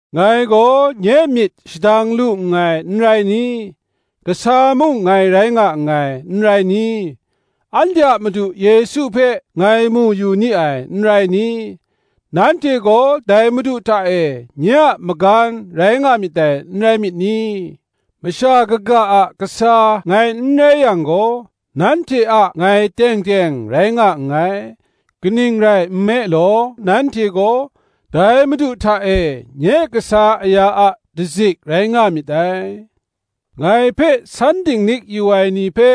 Ngai gaw nye myit shadang lu nngai, n rai ni? Kasa mung ngai rai nga nngai, n rai ni? anhte a Madu Yesu hpe ngai mu yu ni ai, n rai ni? nanhte gaw, dai Madu hta e, nye a magan rai nga myit dai, n rai myit ni? Masha kaga a kasa ngai n rai yang gaw, nanhte a ngai teng teng rai nga nngai; kaning rai nme law, nanhte gaw, dai Madu hta e, nye kasa aya a dazik rai nga myit dai. Ngai hpe san dinglik yu ai ni hpe,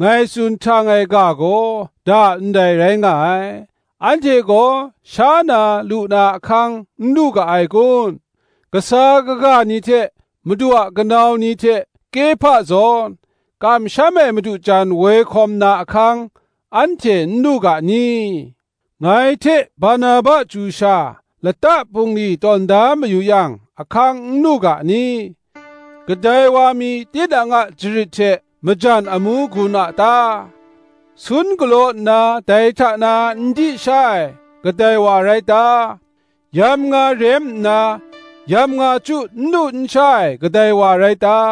ngai tsun htang ai ga gaw, da ndai rai nga ai. Anhte gaw sha na lu na ahkang n lu ga ai kun? Kasa kaga ni hte, Madu a kanau ni hte Kehpa zawn, kamsham ai madu jan woi hkawm na ahkang, anhte n lu ga ni? Ngai hte Barnaba chyu sha lata bungli tawn da mayu yang, ahkang n lu ga ni? Kadai wa mi tinang a jarit hte majan amu gun a ta? Sun galaw nna dai hta na n di sha ai, kadai wa rai ta? Yamnga rem nna, yamnga chyu n lu n sha ai, kadai wa rai ta?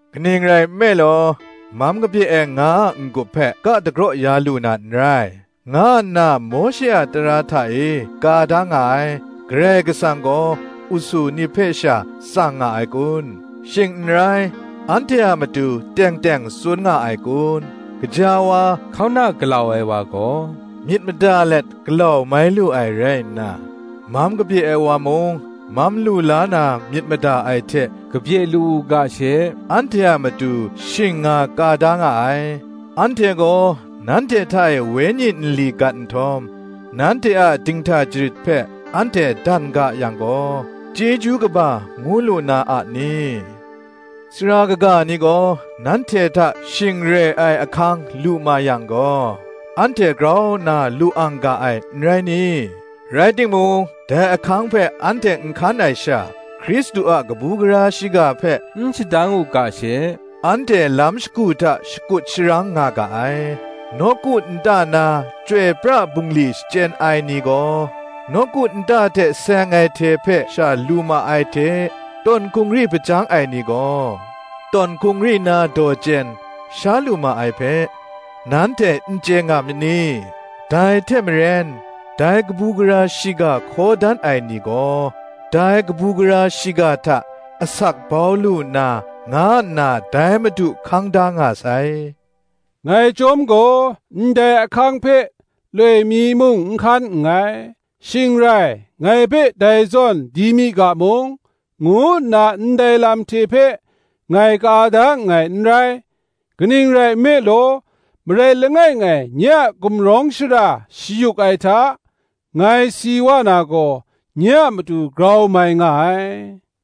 Kaning rai nme law, Mam kabye ai nga a n-gup hpe ka dagraw ya lu na n rai, nga nna Mawshe a tara hta e ka da nga ai. Karai Kasang gaw usu ni hpe sha tsang nga ai kun? shing n rai, anhte a matu teng teng tsun nga ai kun? Gaja wa, hkauna galau ai wa gaw, myit mada let galau mai lu ai rai nna, mam kabye ai wa mung, mam lu la na myit mada ai hte kabye lu u ga she, anhte a matu shing nga ka da nga ai. Anhte gaw nanhte hta e wenyi nli gat nhtawm, nanhte a dinghta jarit hpe anhte dan ga yang gaw, chyeju kaba ngu lu na a ni? Sara kaga ni gaw nanhte hta shing re ai ahkang lu ma yang gaw, anhte grau nna lu ang ga ai, n rai ni? Rai timung, dai ahkang hpe anhte n hkan ai sha, Hkristu a kabu gara shiga hpe n shadang u ga she, anhte lam shagu hta shakut sharang nga ga ai. nawku nta na chyoi pra bungli shachyen ai ni gaw, nawku nta hte seng ai hte hpe sha lu ma ai hte, tawn hkungri hpajang ai ni gaw, tawn hkungri na daw chyen, sha lu ma ai hpe, nanhte n chye nga myit ni? Dai hte maren, dai kabu gara shiga hkaw dan ai ni gaw, dai kabu gara shiga hta asak bau lu na, nga nna dai Madu hkang da nga sai. Ngai chyawm gaw, ndai ahkang hpe loi mi mung n hkan nngai. Shing rai, ngai hpe dai zawn di mi ga mung, ngu nna ndai lam hte hpe ngai ka da nngai n rai; kaning rai nme law, marai langai ngai nye a gumrawng shara shayuk ai hta, ngai si wa na gaw, nye a matu grau mai nga ai.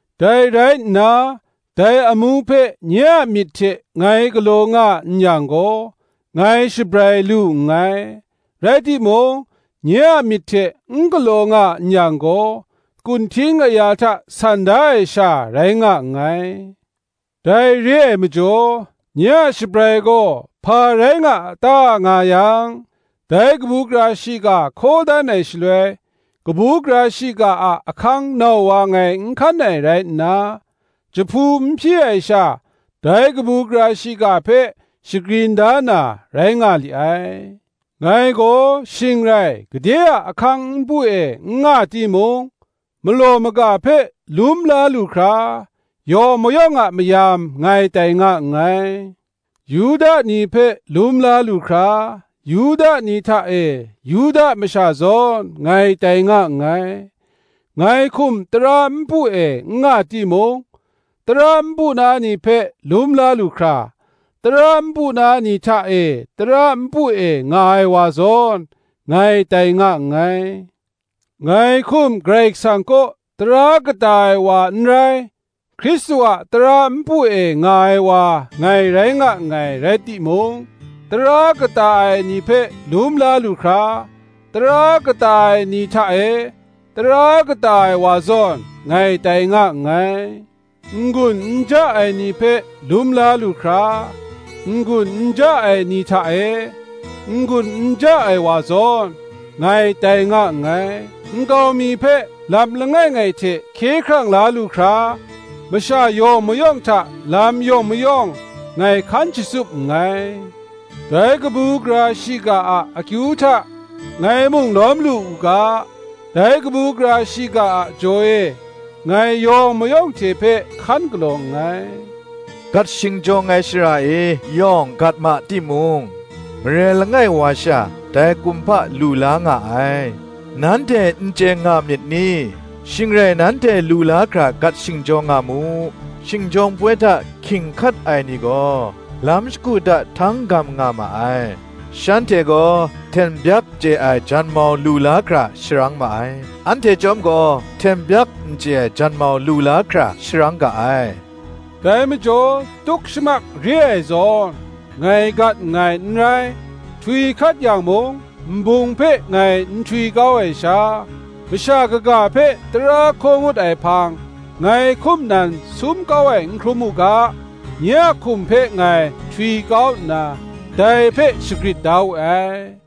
Dai rai nna, dai amu hpe nye a myit hte ngai galaw nga n yang gaw, ngai shabrai lu nngai; rai timung, nye a myit hte n galaw nga n yang gaw, kunhting aya hta san da ai sha rai nga nngai. Dai re ai majaw, nye a shabrai gaw hpa rai nga a ta, nga yang, dai kabu gara shiga hkaw dan ai shaloi, kabu gara shiga a ahkang nau wa ngai n hkan ai rai nna, jahpu n hpyi ai sha, dai kabu gara shiga hpe shagrin da na, rai nga li ai. Ngai gaw shing rai gade a ahkang npu e n nga timung, malaw maga hpe lum la lu hkra, yawng mayawng a mayam ngai tai nga nngai. Yuda ni hpe lum la lu hkra, Yuda ni hta e Yuda masha zawn, ngai tai nga nngai; ngai hkum tara npu e n nga timung, tara npu na ni hpe lum la lu hkra, tara npu na ni hta e tara npu e nga ai wa zawn, ngai tai nga nngai. Ngai hkum Karai Kasang kaw tara kata ai wa n rai, Hkristu a tara npu e nga ai wa ngai rai nga nngai rai timung, tara kata ai ni hpe lum la lu hkra, tara kata ai ni hta e, tara kata ai wa zawn, ngai tai nga nngai. N-gun n ja ai ni hpe lum la lu hkra, n-gun n ja ai ni hta e, n-gun n ja ai wa zawn, ngai tai nga nngai: nkau mi hpe lam langai ngai hte hkye hkrang la lu hkra, masha yawng mayawng hta lam yawng mayawng, ngai hkan shatsup nngai. Dai kabu gara shiga a akyu hta ngai mung lawm lu u ga, dai kabu gara shiga a jaw e ngai yawng mayawng hte hpe hkan galaw nngai. Gat shingjawng ai shara e yawng gat ma timung, marai langai wa sha dai kumhpa lu la nga ai, nanhte n chye nga myit ni? Shing rai nanhte lu la hkra gat shingjawng nga mu; shingjawng poi hta hkying hkat ai ni gaw, lam shagu hta htang gam nga ma ai. Shanhte gaw hten byak chye ai janmau lu la hkra sharang ma ai; anhte chyawm gaw hten byak n chye ai janmau lu la hkra sharang ga ai. Dai majaw tuk shamak re ai zawn, ngai gat nngai n rai; htwi hkat yang mung, nbung hpe ngai n htwi kau ai sha, masha kaga hpe tara hkaw ngut ai hpang, ngai hkum nan sum kau ai n hkrum u ga, nye a hkum hpe ngai htwi kau nna, dai hpe shagrit da we ai.